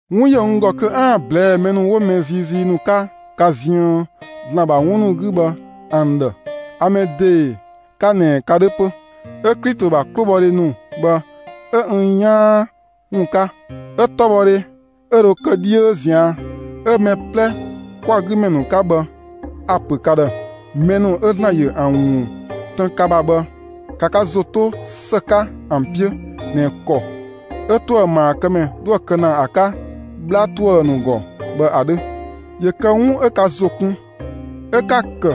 'Wun ‑yö n ‑gɔ kö 'aan‑ ꞊blɛɛ'‑ mɛ ‑nu 'wo mɛ ziizii ‑nu 'ka ka ziën ‑Zlan ‑bha ‑wun ‑nu 'gü bhë ‑an ‑dhë; a mɛ ‑dee 'ka ꞊nɛ ka 'dhö 'pö, 'ö Klito ‑bha 'klobhɔdhe ‑nu bhë 'ö n 'yaan ‑wun 'ka, 'ö 'tɔbhɔdhe 'ö dho kë 'dhiö ꞊zian' 'ö mɛ 'plɛ kwa‑ 'gü ‑mɛ ‑nu 'ka bhë, a‑ ‑pö ka ‑dhë: Mɛ ‑nu 'ö ‑Zlan ‑yö ‑an ‑wun tën ka ‑bha bhë, ‑ka ka ‑zo 'to ‑së 'ka ‑an 'piö ꞊nɛ ‑kɔ 'ö ‑tuëmaakëmɛ 'dhoë‑ kë ‑na ‑a 'ka 'bhla ‑tuë ‑nu ‑gɔ bhë ‑a 'dhö; ‑yö kë 'wun 'ö ka ‑zo kun 'ö 'ka‑ ‑kë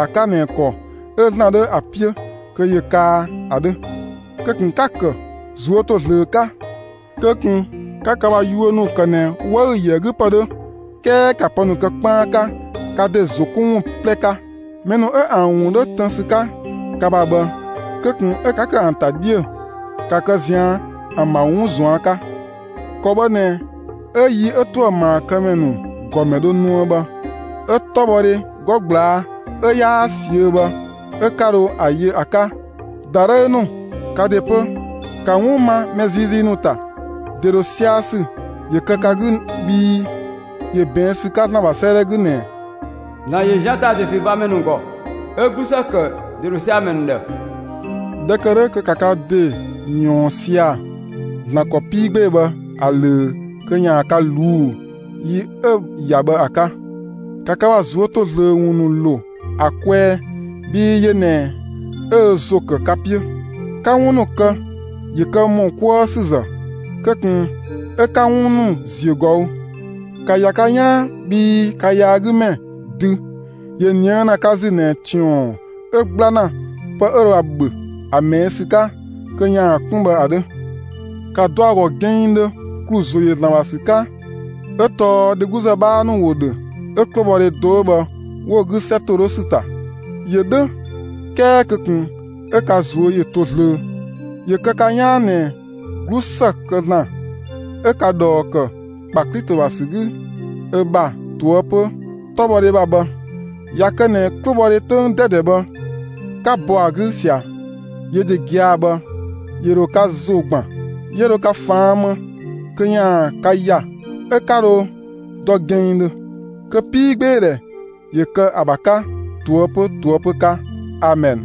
‑a 'ka ꞊nɛ ‑kɔ 'ö ‑Zlan 'dhö ‑a 'piö kö ‑yö kaa ‑a 'dhö; kö ꞊kun 'ka‑ ‑kë ꞊zuö' ‑to zlöö 'ka. Kö ꞊kun 'ka ka ‑bha yuö ‑nu ‑kë ꞊nɛ 'wëü‑ yö ‑a 'gü ‑pë 'dhö, 'kɛɛ ‑ka pë ‑nu kë 'kpaan 'ka, ka ‑de ‑zo 'kun ‑wun 'plɛ 'ka. Mɛ ‑nu 'ö ‑an ‑wun 'dhö tën ‑sü 'ka ka ‑bha bhë, kö ꞊kun 'ö 'ka ‑kë ‑an ‑ta 'dhiö‑; ‑ka kë ꞊zian' ‑an ‑bha 'wun ꞊zuan' 'ka. ‑Kɔ bhë ꞊nɛ 'ö yi 'ö ‑tuëmaakëmɛ ‑nu ‑gɔmɛ dho nuë bhë, 'ö 'tɔbhɔdhe 'gɔ ꞊gblaa' 'ö 'yaa ꞊siö'‑ bhë 'ö 'ka dho ‑a yö ‑a 'ka. ‑Dadhëü ‑nu, ka ‑de 'pö, ‑ka 'wun ma mɛ ziizii ‑nu ‑ta! ‑De ‑dho sia‑ ‑sü ‑yö kë ka 'gü bhii ‑yö ꞊bɛɛn' ‑sü 'ka ‑Zlan ‑bha 'sëëdhɛ 'gü ꞊nɛ: ‑Zlan ‑yö zian ‑ta ‑desüvamɛ ‑gɔ 'ö 'glusë ‑kë ‑de ‑dho sia‑ ‑mɛ ‑nu ‑dhë. ꞊Dhɛ ‑kë 'dhö kö ‑ka ka ‑de ꞊yɔɔn sia‑ ‑Zlan ‑kɔ 'pii 'gbee‑ bhë ‑a ꞊löö kö ‑yaan ka ꞊luu'‑ yi 'ö‑ ‑ya bhë ‑a 'ka. ‑Ka ka ‑bha ꞊zuö' ‑to zlöö ‑wun ‑nu ‑lo ‑a kwɛɛ bhii yö ꞊nɛ 'ö ö ‑zo ‑kë ka 'piö. 'Ka 'wun ‑nu kë, ‑yö kë ‑mɔ 'kuë ‑sü ‑zë; kö ꞊kun 'ö 'ka 'wun ‑nu ‑ziö ꞊gɔü'. ‑Ka ‑ya ka 'yaan bhii ka yaagümɛ, dü, ‑yö ꞊nië' ‑na ka ‑zü ꞊nɛ ‑tiɔn 'ö 'gbla ‑na pë 'ö dho ‑a ‑bhö ‑a ꞊mɛɛ' ‑sü 'ka kö ‑yaan 'kun bhë ‑a 'dhö. ‑Ka dɔ ‑a ‑gɔ gɛnngdhö, ‑klu ‑zo ‑yö ‑Zlan ‑bha ‑sü 'ka 'ö tɔɔ dhegluzë 'bhaa ‑nu ‑wo ‑dhö 'ö 'klobhɔdhe do 'ö bhë 'wo‑ 'gü 'sɛ ‑to 'dhö ‑sü ‑ta. ‑Yö 'dhö 'kɛɛ kö ꞊kun 'ö ka ꞊zuö' ‑yö to zlöö; ‑yö kë ka 'yaan ꞊nɛ 'glusë kë ‑Zlan 'ö ka ꞊dhɔɔ ‑kë ‑kpa Klito ‑bha ‑sü 'gü ö ‑bha ꞊toëpö 'tɔbhɔdhe ‑bha bhë, ꞊ya kë ꞊nɛ 'klobhɔdhe 'töng 'dɛdɛ bhë, 'ka bɔ ‑a 'gü ꞊sia, yö ‑de gia‑ bhë ‑yö ‑dho ka ‑zo ‑gban, 'yö dho ka ꞊faan' më kö ‑yaan ka ‑ya, 'ö 'ka ‑dho dɔ gɛnngdhö. Kö 'piigbeedhɛ ‑yö kë ‑a ‑bha 'ka ꞊toëpö ꞊toëpö 'ka! Amɛn.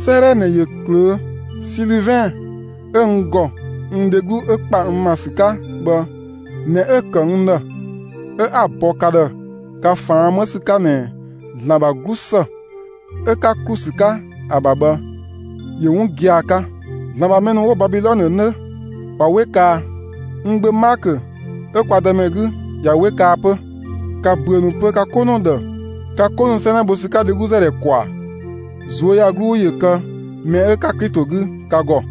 'Sëëdhɛ ꞊nɛ ꞊yö ꞊klöö'; Silivɛn 'ö n ‑gɔ n dheglu 'ö ‑kpa n ‑ma ‑sü 'ka bhë ꞊nɛ 'ö‑ ‑kë n ‑dhë 'ö 'a‑ bɔ ka ‑dhë ka ꞊faan' 'më ‑sü 'ka ꞊nɛ ‑Zlan ‑bha 'glusë 'ö 'ka ‑klu ‑sü 'ka ‑a ‑bha bhë ‑yö 'wun gia‑ 'ka. ‑Zlan ‑bha mɛ ‑nu 'wo Babilɔnë 'nö, ꞊wa 'we kaa. N gbö Maakö 'ö kwa Dëmɛ 'gü ꞊ya 'we kaa 'pö. ‑Ka ‑büö ‑nu pö ka 'ko ‑nu ‑dhë ka 'ko ‑nu 'sɛnɛ bho ‑sü 'ka dhegluzë ‑dhɛ ‑kwaa. ꞊Zuöyagluu ‑yö kë mɛ 'ö 'ka Klito 'gü ka ‑gɔ!